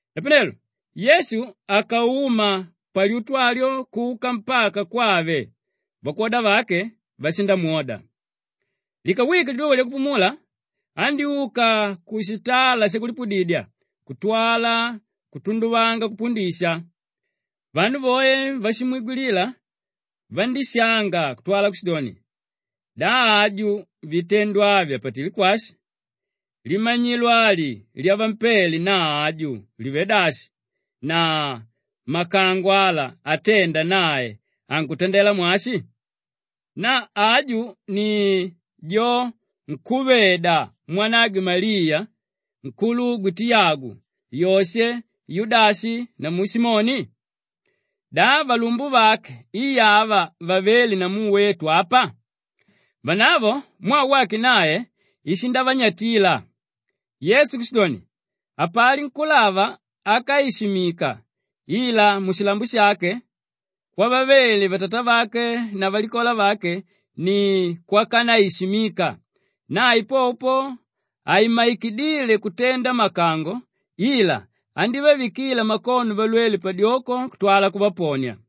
Napanelo Yesu akauma palyutu alyo kuka mpaka kwave; vakwoda vake vashindamwoda. Likawike liduva lyakupumula andyúka kushitala shakulipudidya kutwala kutunduvanga kupundisha; vanu voe váshimwigwilila vandíshanga kutwala kushidoni, “Na aju vitendo avi apatilé kwashi? Limanyilo ali lyavampele na aju livé dashi na makango ala atenda nae ankutandela mwashi? Na aju i jo nkúveda mwanagwe Maliya, nkulugwe Tiyagu, Yoshe, Yudashi namu Simoni? Da valumbuvake i ava vavéle namu wetu apa?” Vanavo mwaa wake nae ishindavanyatila. Yesu kushidoni, “Hapali nkúlava ákaishimika ila mushilambo shake kwavavele vatatavake na valikola vake ni kwakanaishimika.” Nae popo po haimmaikidile kutenda makango ila andívavikila makono valwele padyoko kutwala kuvaponia.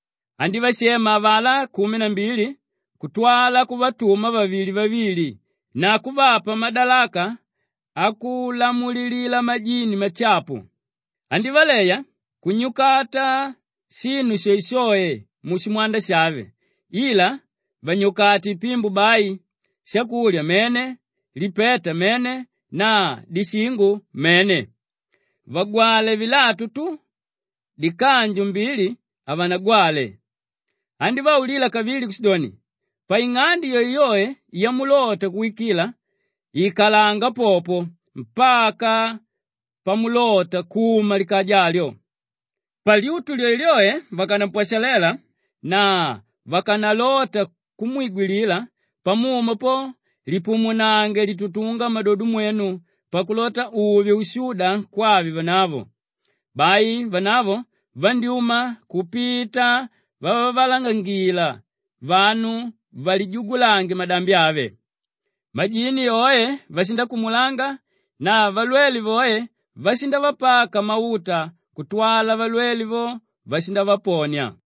Andívashema avalá kumi na mbili kutwala kuvatuma vavili-vavili na kuvapa madalaka akulamulilila majini mashapu. Andívaleya kunyukata shinu shoeshoe mushimwanda shave ila vanyukate ipimbo bai; shakulya mene, lipeta mene na dishingo mene. Vagwale vilatu tu; dikanju mbili havanagwale. Andívaulila kavili kushidoni, “Paing'ande yoeyoe yamulota kuwikila, ikalanga popo mpaka pamulota kuma likaja alyo. Palyutu lyoelyoe vakanampwashalela na vakanalota kumwigwilila, pamuma po, lipumunange litutunga mmadodo mwenu pakulota uve ushuda kwave vanavo.” Bai vanavo vandyúma kupita vavalangangila vanu valijugulange madambi ave. Majini oe vashindakumulanga na valwele voe vashindavapaka mauta kutwala valwele vo vashindavaponia.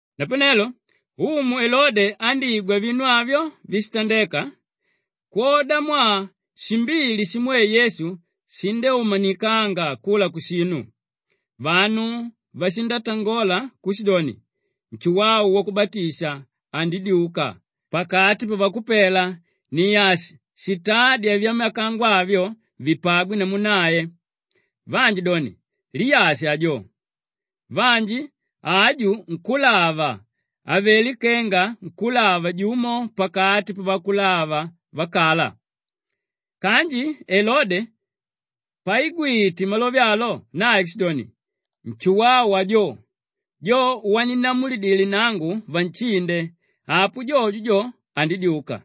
Napanelo umu Elode andígwa vinu avyo víshitandeka kwodamwaa shimbili shimwe Yesu shindyúmanikanga kula kushinu. Vanu vashindatangola kushidoni, “Nshuwau Wakubatisha andidyuka pakati pavakupela ni ashi shitádya vyamakango avyo vipagwe namu nae.” Vanji doni, “Liyashi ajo.” Vanji, “Aju nkúlava, avelé kenga nkúlava jumo pakati pavakulava vakala.” Kanji Elode paigwite malove alo nae kushidoni, “Nshuwau ajo; jo waninnamulidile nangu vanshinde, apo jojo jo, andidyuka.”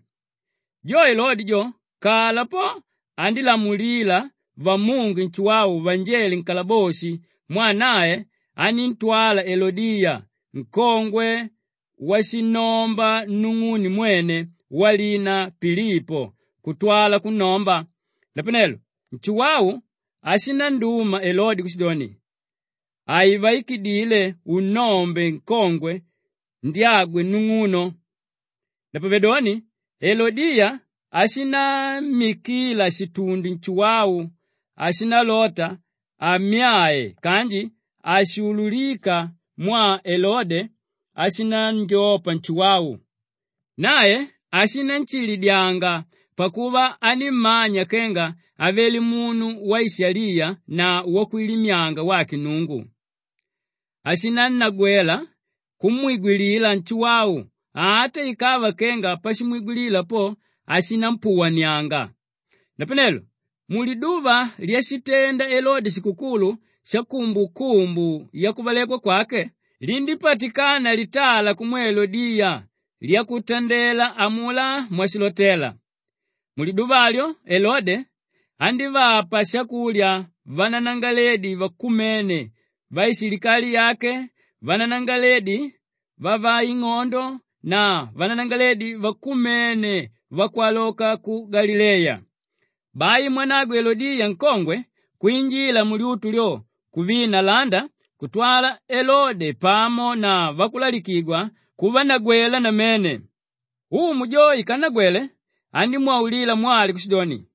Jo Elode jo, kala po andílamulila vamunge Nshuwau vanjele nkalaboshi mwaa nae aníntwala Elodiya nkongwe washinnomba nung'une mwene walina Pilipo kutwala kunnomba. Napanelo Nshuwau ashinanduma Elode kushidoni, “Haikuvaikidile unnombe nkongwe ndyagwe nung'uno.” Napavedoni Elodiya ashinammikila shitundi Nshuwau, ashindalota ammyae kanji haishuulukika mwaa Elode ashinanjopa Nshuwau. Nae ashinanshilidyanga pakuva anímmanya kenga avele munu waishaliya na wakwilimyanga wake Nnungu. Ishinannagwela kumwigwilila Nshuwau ata ikava kenga pashimwigwilila po, ashinampuwanianga. Napanelo muliduva lyashitenda Elode shikukulu shakumbukumbu yakuvalekwa kwake lindípatikana litala kumwe Elodiya lyakutandela amulá mwashilota. Muliduva alyo Elode andívapa shakulya vananangalaledi vakumene vaishilikali yake, vananangalaledi vavaing'ondo na vananangalaledi vakumene vakwaloka ku Galileya. Bai mwanagwe Elodiya nkongwe kwinjila mulyutu lyo kuvina landa kutwala Elode pamo na vakulalikigwa kuvanagwela namene. Umu jo ikannagwele, andímwaulila mwali kushidoni,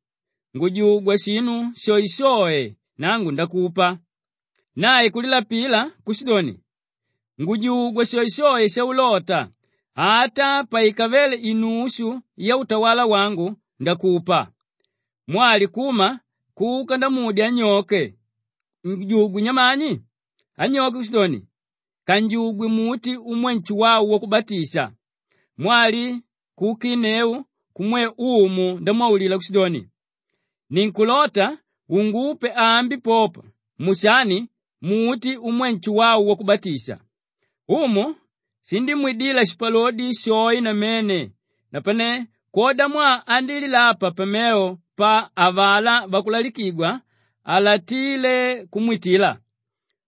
“Ngujugwa shinu shoeshoe nangu ndakupa!” Nae kulilapila kushidoni, “Ngujugwa shoeshoe shaulota, ata paikavele inushu yautawala wangu, ndakupa.” Mwali kuma kuka ndamudya anyoke, “Ngujugwe nyamani?” Anyoke kushidoni, “Kanjugwe muti umwe Nshuwau Wakubatisha.” Mwali kuukinneu kumwe umu ndamwaulila kushidoni, “Ninkulota ungupe ambi popa mushani muti umwe Nshuwau Wakubatisha.” Umu shindímwidila shipalodi shoe namene napane kwodamwaa andílilapa pamevo pa avalá vakulalikigwa, halatíle kumwitila.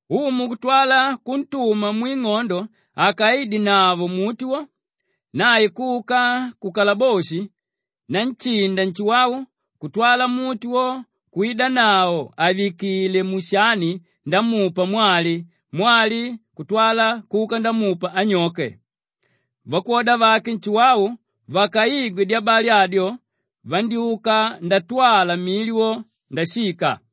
Umu kutwala kuntuma mwing'ondo akaidenavo muti wo. Nae kuka kukalaboshi nanshinda Nshuwau kutwala muti wo kwidanavo àvikile mushani ndamupa mwali, mwali kutwala kuka ndamupa anyoke. Vakwoda vake Nshuwau vakaigwe dyabali adyo vandyúka ndatwala mili wo ndashika.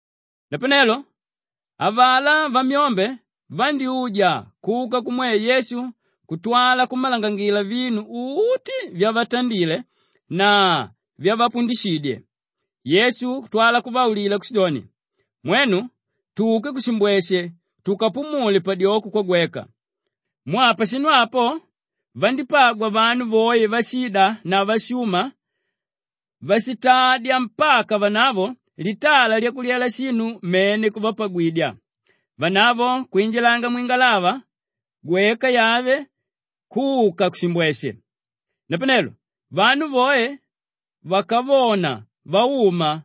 Napanelo avalá vamyombe vandyúja kuka kumwe Yesu kutwala kummalangangila vinu uti vyavatandile na vyavapundishidye. Yesu kutwala kuvaulila kushidoni, “Mwenu, tuke kushimbweshe tukapumule padyoko kwagweka.” Mwaa pashinu apo vandípagwa vanu voe váshida na váshuma váshitadya mpaka vanavo litala lyakulyela shinu mene kuvapagwidya. Vanavo kwinjilanga mwingalava gweka yave kuka kushimbweshe. Napanelo vanu voe vakavona vauma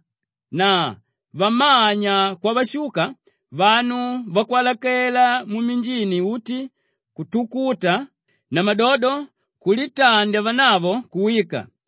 na vamanya kwavashuka, vanu vakwalakela mminjini uti kutukuta namadodo kulitandya vanavo kuwika.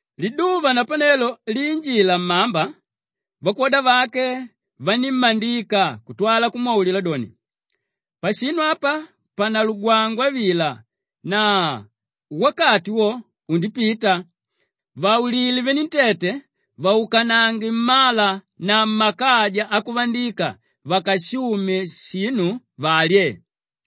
Liduva napanelo liinjila mmamba, vakwoda vake vanímmandika kutwala kumwaulila doni, “Pashinu apa panalugwangwa vila na wakati wo undipita. Vaulile venentete vaukanange mmala na mmakaja akuvandika vakashume shinu valye.”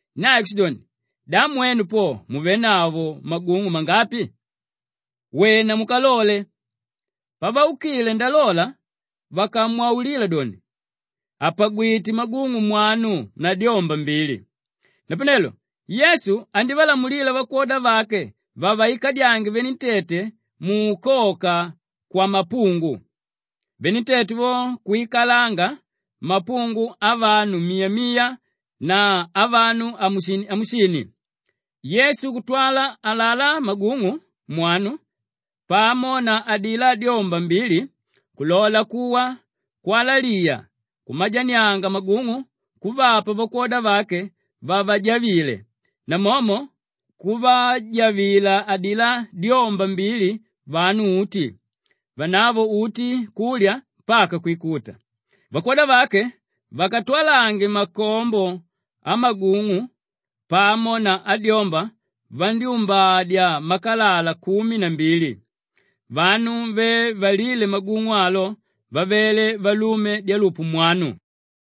Nae kushidoni, “Da mwenu po muvénavo magung'u mangapi? Wena mukalole!” Pavaukile ndalola vakamwaulila doni, “Apagwité magung'u mwanu na dyomba mbili.” Napanelo Yesu andívalamulila vakwoda vake vavikadyange venentete muukoka kwamapungu. Venentete vo kwikalanga mapungu avanu miya-miya na avanu amusini-amusini. Yesu kutwala alalá magung'u mwanu pamo na adilá dyomba mbili kulola kuwa kwalaliya kumajanianga magung'u kuvapa vakwoda vake vavajavile namomo kuvajavila adilá dyomba mbili vanu uti. Vanavo uti kulya mpaka kwikuta. Vakwoda vake vakatwalange makombo amagung'u pamo na adyomba vandyúmbadya makalala kumi na mbili. Vanu ve valíle magung'u alo vavele valume dyalupu mwanu.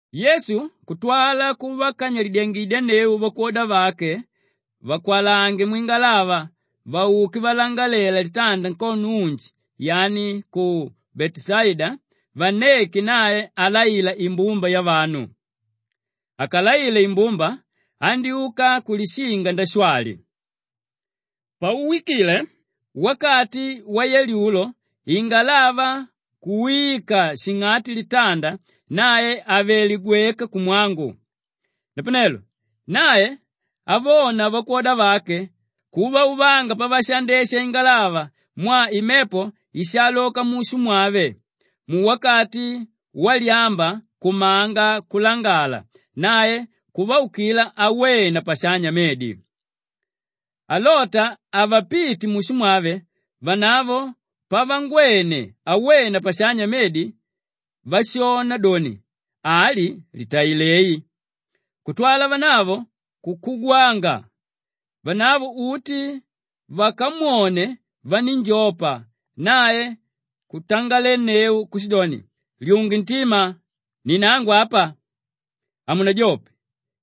Yesu kutwala kuvakanyalidyangidyanneu vakwoda vake vakwalange mwingalava vauke valangalela litanda nkono unji yani ku Beteshaida vanneke nae alaila imbumba yavanu. Akalaile imbumba, andyúka kulishinga ndashwali. Pauwikile wakati wayalyulo ingalava kuwika shing'ati litanda nae avelé gweka kumwangu. Napanelo nae avona vakwoda vake kuvauvanga pavashandesha ingalava mwaa imepo ishaaloka mushu mwave, muwakati walyamba kumanga kulangala, nae kuvaukila awena pashanya medi. Alota avapite mushu mwave, vanavo pavangwene awena pashanya medi, vashona doni, “Ali litailei,” kutwala vanavo kukugwanga. Vanavo uti vakamwone vanínjopa, nae kutangalenneu kushidoni, “Lyunge ntima! Ni nangu apa. Hamunajope!”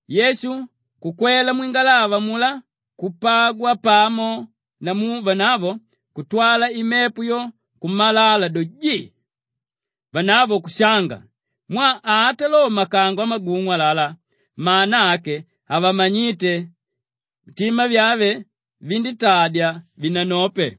Yesu kukwela mwingalava amulá kupagwa pamo namu vanavo kutwala imepo yo kumalala do, jii! Vanavo kushanga mwaa ata lo makango amagung'u alalá, mana ake havamanyíte; mitima vyave vandítadya vinanope.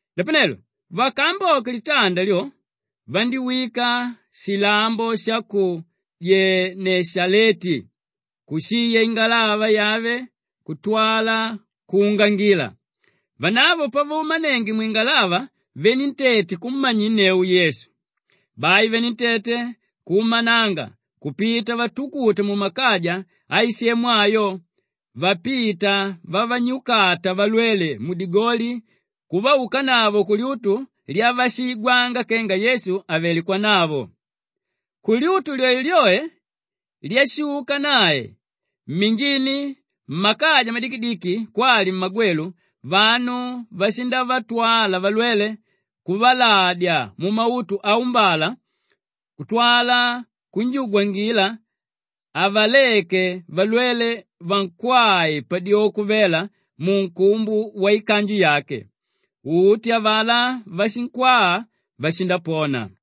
Napanelo vakaamboke litanda lyo vandíwika shilambo sha ku Geneshaleti kushiya ingalava yave kutwala kuungangila. Vanavo pavaumanenge mwingalava venentete kummanyinneu Yesu. Bai venentete kuumananga kupita vatukuta mumakaja aisemu ayo vapita vavanyukata valwele mudigoli kuvaukanavo kulyutu lyavashiigwanga kenga Yesu avelé kwanavo. Kulyutu lyoelyoe kwashuka nae, mminjini mmakaja madikidiki kwali mmagwelu, vanu vashindavatwala valwele kuvaladya mumautu aumbala kutwala kunjugwangila avaleke valwele vankwae padyoko vela munkumbu waikanju yake. Uti avalá váshinkwaa, vashindapona.